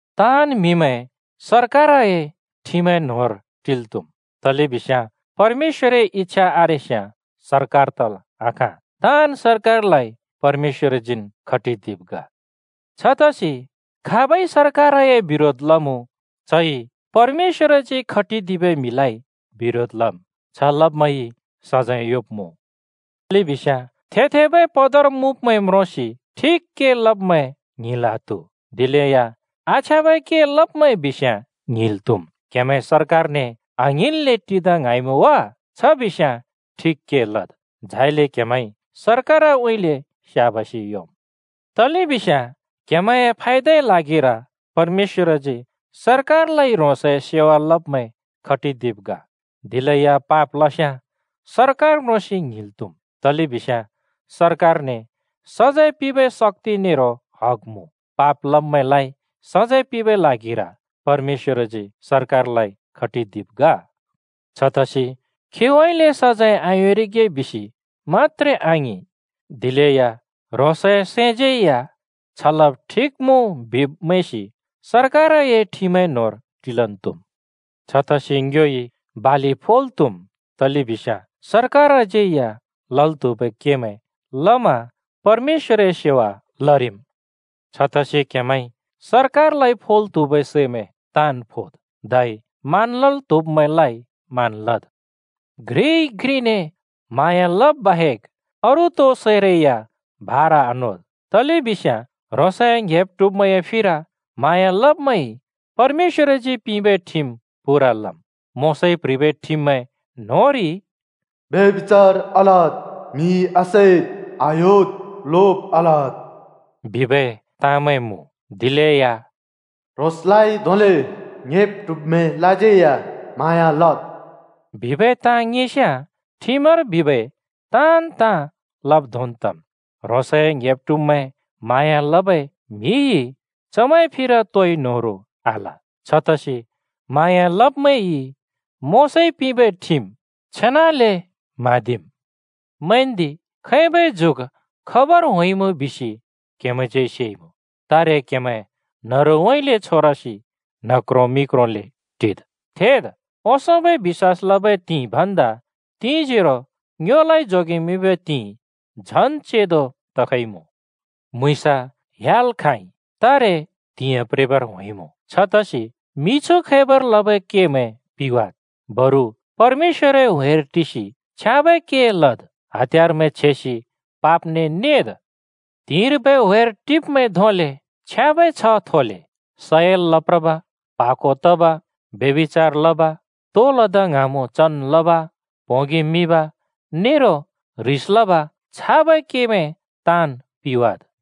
ताँन् म्हिमैं सरकारए ठिमए न्होंर टिल् त्‍हुम्, तलेबिस्याँ परमेश्‍वरए इच्छा आरेस्याँ सरकार तल् आखाँ। ताँन् सरकारलाइ परमेश्‍वरजीन् खटिदिब् ग। छतसि खाबइ सरकारए बिरोध लमुँ चइ परमेश्‍वरजी खटिदिबै म्हिलाइ बिरोध लम्। छ लब्‍मैंइ सजैं योंब्‍मुँ, तलेबिस्याँ थेब-थेबै पद मुँब्मैं म्रोंसि ठिक के लब्‍मैं ङ्हिंल् आत्‍हु, दिलेया आछ्याँबै के लब्‍मैं बिस्याँ ङ्हिंल् त्‍हुम्। क्‍हेमैं सरकारने आङ्हिंल्‍ले टिदा ङ्हाँइमुँ वा? छ बिस्‍याँ ठिक के लद्, झाइले क्‍हेमैंइ सरकारउँइँले स्‍याबासि योंम्, तलेबिस्याँ क्‍हेमैंए फायदाए ल्हागिर परमेश्‍वरजी सरकारलाइ ह्रोंसए सेवा लब्मैं खटिदिब् ग। दिलेया पाप लस्‍याँ सरकार म्रोंसि ङ्हिंल् त्‍हुम्, तलेबिस्याँ सरकारने सजैं पिंबै शक्‍ति नेरो हग मुँ। पाप लब्‍मैंलाइ सजैं पिंबै ल्हागिर परमेश्‍वरजी सरकारलाइ खटिदिब् ग। छतसि खीउँइँले सजैं आयोंरिगे बिसि मत्‍त्रे आङिं, दिलेया ह्रोंसए सैंज्यै या “छ लब ठिक मुँ” बिब् मैंसि सरकारए ठिमए न्होंर टिलन् त्‍हुम्। छतसि ङ्योइ बालि फोल् त्‍हुम् तलेबिस्याँ सरकारज्यै या लल् त्हुबै केमैं लमा परमेश्‍वरए सेवा लरिम्। छतसि क्हेमैंइ सरकारलाइ फोल् त्‍हुबै सैमैं ताँन् फोद्। धै मान लल् त्‍हुब्‍मैंलाइ मान लद्। घ्रिइ घ्रिने म्हाँया लब बाहेक अरू तो सैरै या भारा आनोद्। तलेबिस्याँ ह्रोंसए ङ्‍हेब् ट्हुब्मैंए फिर म्हाँया लब्‍मैंइ परमेश्‍वरजी पिंबै ठिम पूरा लम्। मोशाइ प्‍ह्रिबै ठिममैं न्‍होंरि “ब्यभिचार आलदु, म्‍हि आसैदु, आह्‍योदु, लोब आलदु,” बिबै ताँमैं मुँ। दिलेया “ह्रोंसलाइ धोंले ङ्‍हेब् ट्हुब्मैंलाज्यै या म्हाँया लद्” बिबै ताँ ङिंस्याँ ठिमर बिबै ताँन् ताँ लब् धोंन् तम्। ह्रोंसए ङ्‍हेब् ट्हुब्मैं म्हाँया लबै म्हिइ चमैंए फिर तोइ न्होह्रों आल। छतसि म्हाँया लब्मैंइ मोशाइ पिंबै ठिम पूराले म्हाँदिम्। मैंन्‍दि, खैबै जुग खबर होंइमुँ बिसि क्‍हेमैंज्यै सेइमुँ। तारे क्‍हेमैं न्‍हरुउँइँले छोरसि न्ह क्रों मि क्रोंले टिद्। थेद्, ओंसोंबै बिश्‍वास लबै त्हिंइ भन्दा तिंजोरो ङ्योलाइ जोगेमिंबै त्हिंइ झन् चेंदो तखइमुँ। म्‍हुँइँस ह्‍याल् खाँइ, तारे त्हिंयाँ प्रेबर होंइमुँ। छतसि मिछु खैबर लबै केमैं पिवाद्। बरु परमेश्‍वरए ह्‍वेर टिसि छ्याँबै के लद्, हत्‍यारमैं छेसि पापने नेद्। त्हिंर्बै ह्‍वेर टिब्‍मैं धोंले छ्याँबै छ्ह थोले। सयल लप्रब, प्हा को तब, ब्यभिचार लब, तो लदा ङ्हाँमुँ चन् लब, प्होंगि मिब नेरो ह्रिस लब छाबै केमैं ताँन् पिवाद्।